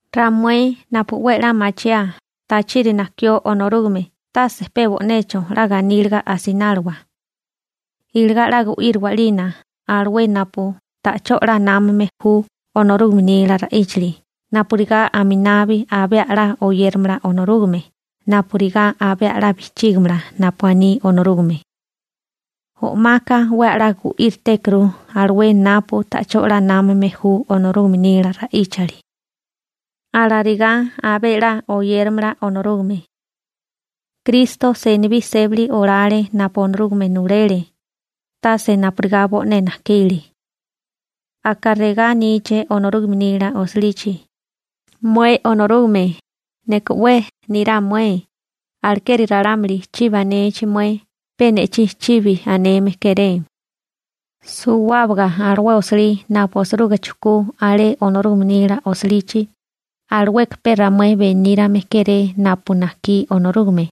Ramué napu 'we a'lá machiaa tachiri najkió Onorúgame tase pe a'bocho 'la ganíliga mochiwa. Iligá 'la gu'íriwa 'lina alué napu ta'chó 'la námame ju Onorúgame nila ra'íchali napurigá aminabi abé a'lá oyéramala Onorúgame napurigá abé a'lá bijchígimala napu aní Onorúgame. O'maka 'we a'lá gu'íritékuru alué napu ta'chó 'la námame ju Onorúgame nila ra'íchali. Alarigá abé a'lá oyéramala Onorúgame. Kristo senibí sébali olale napu Onorúgame nulele, tase napurigá bo'né najkile. Aka regá aníché Onorúgame nila osilichi: «Mué Onorúgame, neka 'we nirá mué, alekeri ralámuli chibi anechi mué, pe ne'chí chibi aneme kéré.» Suwábaga alué osilí napu osiruga chujkú alé Onorúgame nila osilichi, alueka pe ramué benírame kéré napu najkí Onorúgame.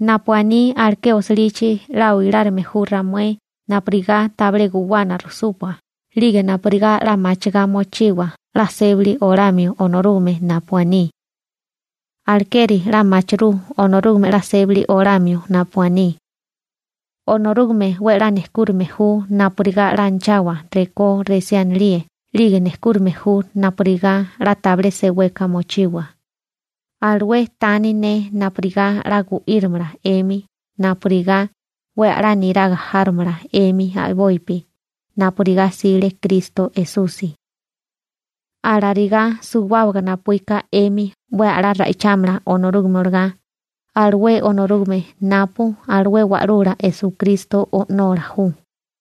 Napu aní aleké osilichi 'la oilárime ju ramué napurigá tabilé guwana rujsúpua 'lige napurigá 'la machigá mochiwa 'la sébali olamio Onorúgame napu aní. Alekeri 'la machirú Onorúgame 'la sébali olamio napu aní. Onorúgame 'we 'la nejkúrame ju napurigá 'la anachawa rekó resí anilíe 'lige nejkúrame ju napurigá 'la tabilé seweka mochiwa, alué tani ne napurigá 'la gu'írimala 'emi napurigá 'we a'lá niraga járomala 'emi a'bopi napurigá 'sile Kristo Esusi. Alarigá suwábaga napuíka 'emi 'we a'lá ra'ichámala Onorúgame olagá, alué Onorúgame napu alué Wa'lula Esukristo O'nola ju.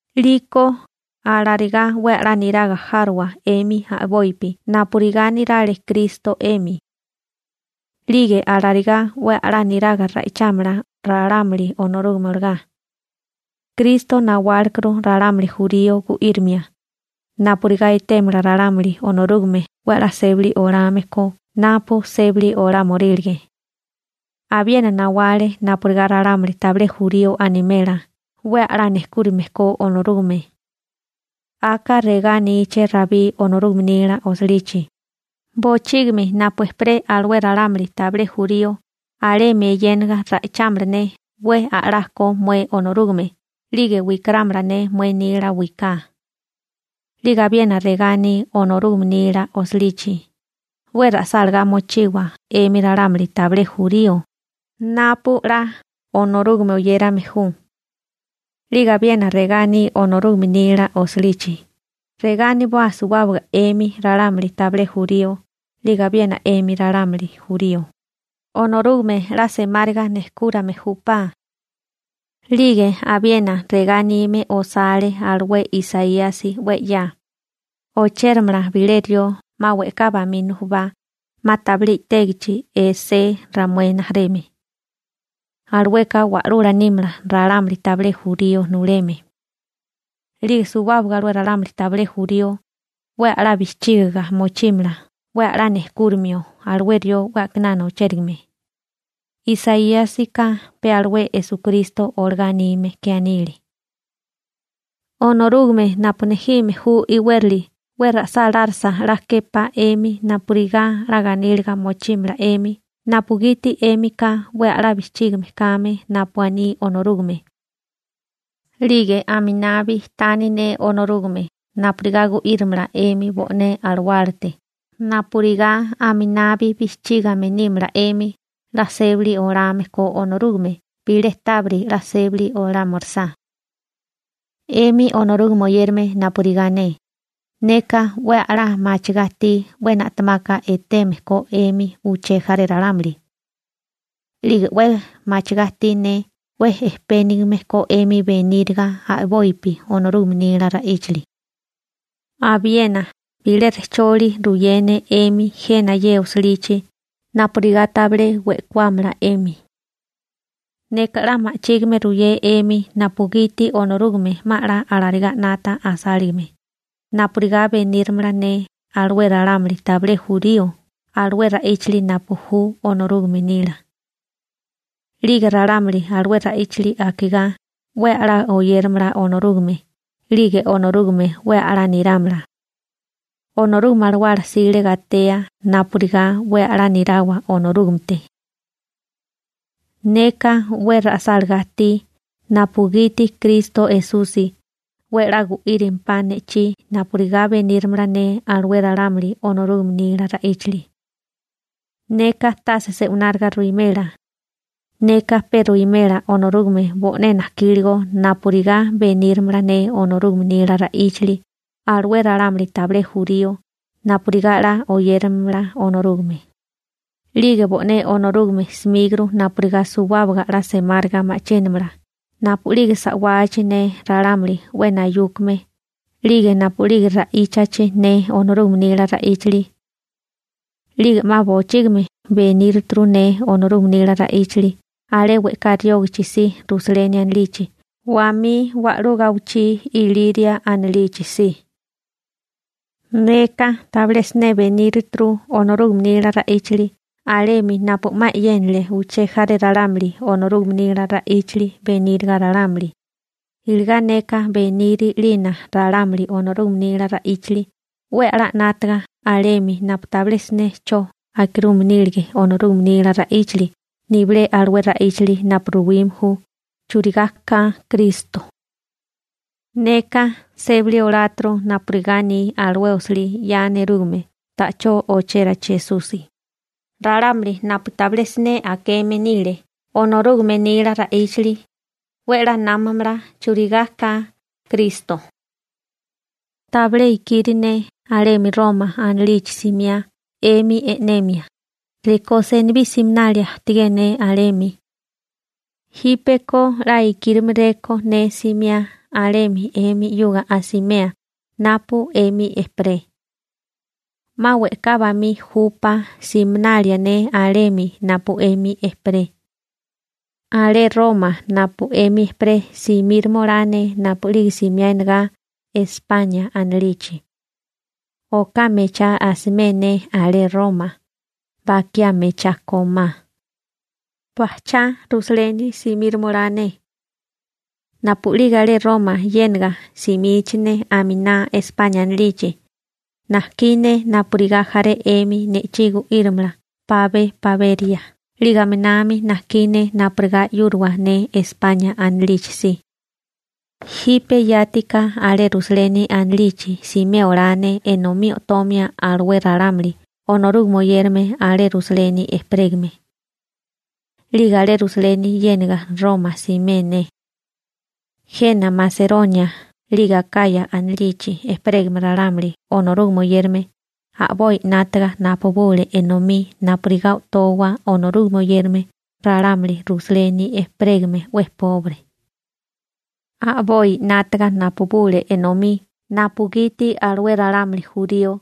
'Liko alarigá 'we a'lá niraga járowa 'emi a'bopi napurigá nirale Kristo 'emi. 'Lige alarigá 'we a'lá niraga ra'ichámala ralámuli Onorúgame olagá. Kristo nawálekuru ralámuli jurío gu'írimia napurigá etémala ralámuli Onorúgame 'we a'lá sébali olame ko napu sébali olámorílige. Abiena nawale napurigá ralámuli tabilé jurío animela 'we a'lá nejkúrame ko Onorúgame. Aka regá aníché Rabí Onorúgame nila osilichi: Bochígimi napu ejperé alué ralámuli tabilé jurío alemi eyéniga ra'ichámala ne 'we a'lá ko mué Onorúgame 'lige wikarámala ne mué nila wiká. 'Lige abiena regá aní Onorúgame nila osilichi: 'We ra'sálagá mochiwa 'emi ralámuli tabilé jurío napu 'la Onorúgame oyérame ju. 'Lige abiena regá aní Onorúgame nila osilichi: Regá aniboa suwábaga 'emi ralámuli tabilé jurío 'lige abiena 'emi ralámuli jurío: «Onorúgame 'la semáriga nejkúrame júpá.» 'Lige abiena regá anime osale alué Isaíasi 'we 'ya: Ochéramala bilé rió 'ma we'ká bamí nujubá 'ma tabilé i'tégichi alué Esé ramué rijimala 'we 'ya ajtígame. Alueka wa'lula nímala ralámuli tabilé jurío nuleme. 'Lige suwábaga alué ralámuli tabilé jurío 'we a'lá bijchígiga mochímala 'we a'lá nejkúrimio alué rió 'we a'kinana ochérigame (Isaíasika pe alué Esukristo olagá anime ke anile). Onorúgame napu nejime ju iwérali 'we ra'sálárisa 'la képá 'emi napurigá 'la ganíliga mochímala 'emi napugiti 'émika 'we a'lá bijchígame kame napu aní Onorúgame. 'Lige aminabi tani ne Onorúgame napurigá gu'írimala 'emi bo'né alawálate napurigá aminabi bijchígame nímala 'emi 'la sébali olame ko Onorúgame bilé tábiri 'la sébali olámirisá. 'Emi Onorúgame oyérame napurigá ne, neka 'we a'lá machigá ajtí 'we na'temaka eteme ko 'emi uché jaré ralámuli. 'Lige 'we machigá ajtí ne 'we ejpénigime ko 'emi beníriga a'bopi Onorúgame nila ra'íchali. Abiena bilé rejcholi ruyé ne 'emi jena ye osilichi napurigá tabilé we'kuámala 'emi. Neka 'la ma'chígime ruyé 'emi napugiti Onorúgame 'ma 'la alarigá 'nata asáligame, napurigá beníramala ne alué ralámuli tabilé jurío alué ra'íchali napu ju Onorúgame nila. 'Lige ralámuli alué ra'íchali akigá 'we a'lá oyéramala Onorúgame 'lige Onorúgame 'we 'la nirámala. Onorúgame Alawala 'sile gatea napurigá 'we 'la nirawa Onorúgamete. Neka 'we ra'sálagá ajtí napugiti Kristo Esusi 'we 'la gu'írimpá ne'chí napurigá beníramala ne alué ralámuli Onorúgame nila ra'íchali. Neka tase se'wináriga ruwimela, neka pe ruwimela Onorúgame bo'né najkíligo napurigá beníramala ne Onorúgame nila ra'íchali alué ralámuli tabilé jurío napurigá 'la oyéramala Onorúgame, 'lige bo'né Onorúgame 'smíguru napurigá suwábaga 'la semáriga ma'chínamala napu'lige sa'wachi ne ralámuli 'we nayúkame (milagro) 'lige napu'lige ra'íchachi ne Onorúgame nila ra'íchali. 'Lige 'ma bochígimi beníruturu ne Onorúgame nila ra'íchali alé we'ká riógachi si Rusaleni anilichi wamí wa'lú gawichí Iliria anilichi si. Neka tabilé siné benírituru Onorúgame nila ra'íchali alemi napu 'ma e'yénale uché jaré ralámuli Onorúgame nila ra'íchali beníriga ralámuli, iligá neka beniri 'lina ralámuli Onorúgame nila ra'íchali 'we a'lá 'nátaga alemi napu tabilé siné 'cho akirume nílige Onorúgame nila ra'íchali nibilé alué ra'íchali napu ruwime ju churigá ka Kristo. Neka sébali oláturu napurigá aní alué osilí 'ya nerúgame ta'chó ochérachi Esusi: Ralámuli napu tabilé siné akeme nile Onorúgame nila ra'íchali 'we 'la námamala churigá ka Kristo. Tabilé ikiri ne alemi Roma anilichi simiá 'emi e'nemia, rekó senibí siminalia ajtigé ne alemi. Jípeko 'la ikírimarékó ne simiá alemi 'emi 'yuga asimea napu 'emi ejperé. 'Ma we'ká bamí júpá siminalia ne alemi napu 'emi ejperé. Alé Roma napu 'emi ejperé simíromolá ne napu'lige simiá enagá España anilichi. Oká mechá asimé ne alé Roma, bakiá mechá kómá. Bajchá Rusaleni simíromolá ne. Napu'lige alé Roma yénaga simichi ne aminá España anilichi, najkí ne napurigá jaré 'emi ne'chí gu'írimala pabé paberia 'lige aminami najkí ne napurigá 'yúriwa ne España anilichi si. Jipe yátiká alé Rusaleni anilichi simé olá ne enomí o'tomia alué ralámuli Onorúgame oyérame alé Rusaleni ejperégame. 'Lige alé Rusaleni yéniga Roma simé ne. Jena Maseronia 'lige Akaya (Gresia) anilichi ejperégame ralámuli Onorúgame oyérame a'boi 'nátaga napabule enomí napurigá o'towa Onorúgame oyérame ralámuli Rusaleni ejperégame 'we pobre. A'boi 'nátaga napabule enomí napugiti alué ralámuli jurío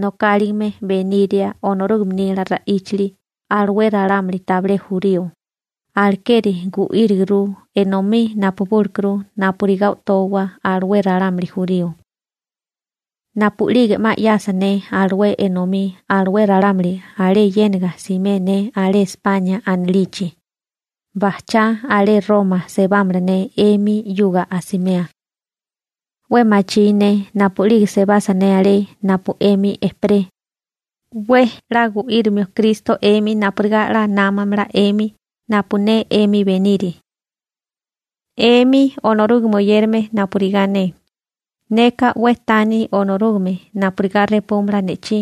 nokáligame beniria Onorúgame nila ra'íchali alué ralámuli tabilé jurío, alekeri gu'íriguru, enomí napabúlekuru napurigá o'towa alué ralámuli jurío. Napu'lige 'ma 'yasa ne alué enomí alué ralámuli alé yéniga simé ne alé España anilichi, bajchá alé Roma sebámala ne 'emi 'yuga asimea. 'We machí ne napu'lige sebasa ne alé napu 'emi ejperé, 'we 'la gu'írimio Kristo 'emi napurigá 'la námamala 'emi napu ne 'emi beniri. 'Emi Onorúgame oyérame napurigá ne, neka 'we tani Onorúgame napurigá repúmala ne'chí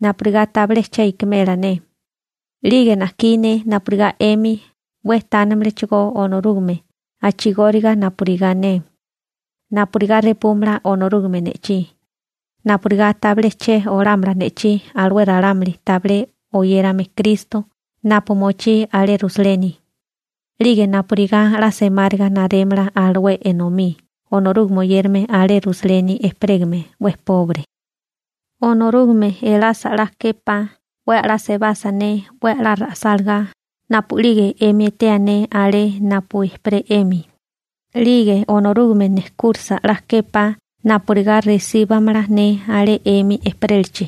napurigá tabilé che ikimela ne, 'lige najkí ne napurigá 'emi 'we tánimalachigó Onorúgame a'chigóriga napurigá ne, napurigá repúmala Onorúgame ne'chí, napurigá tabilé che olámala ne'chí alué ralámuli tabilé oyérame Kristo napu mochí alé Rusaleni, 'lige napurigá 'la semáriga narémala alué enomí Onorúgame oyérame alé Rusaleni ejperégame tabilé nígame, Onorúgame elasa 'la képá 'we a'lá sebasa ne 'we 'la ra'sálagá napu'lige 'emi etea ne alé napu ejperé 'emi, 'lige Onorúgame nejkúrisa 'la képá napurigá resíbamala ne alé 'emi ejperélachi.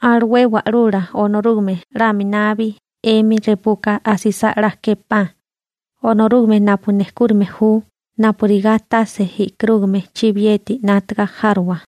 Alué Wa'lula Onorúgame 'la aminabi 'emi repuka asisá 'la képá, Onorúgame napu nejkúrime ju napurigá tase e'karúgame chibiyeti 'nátaga járowa.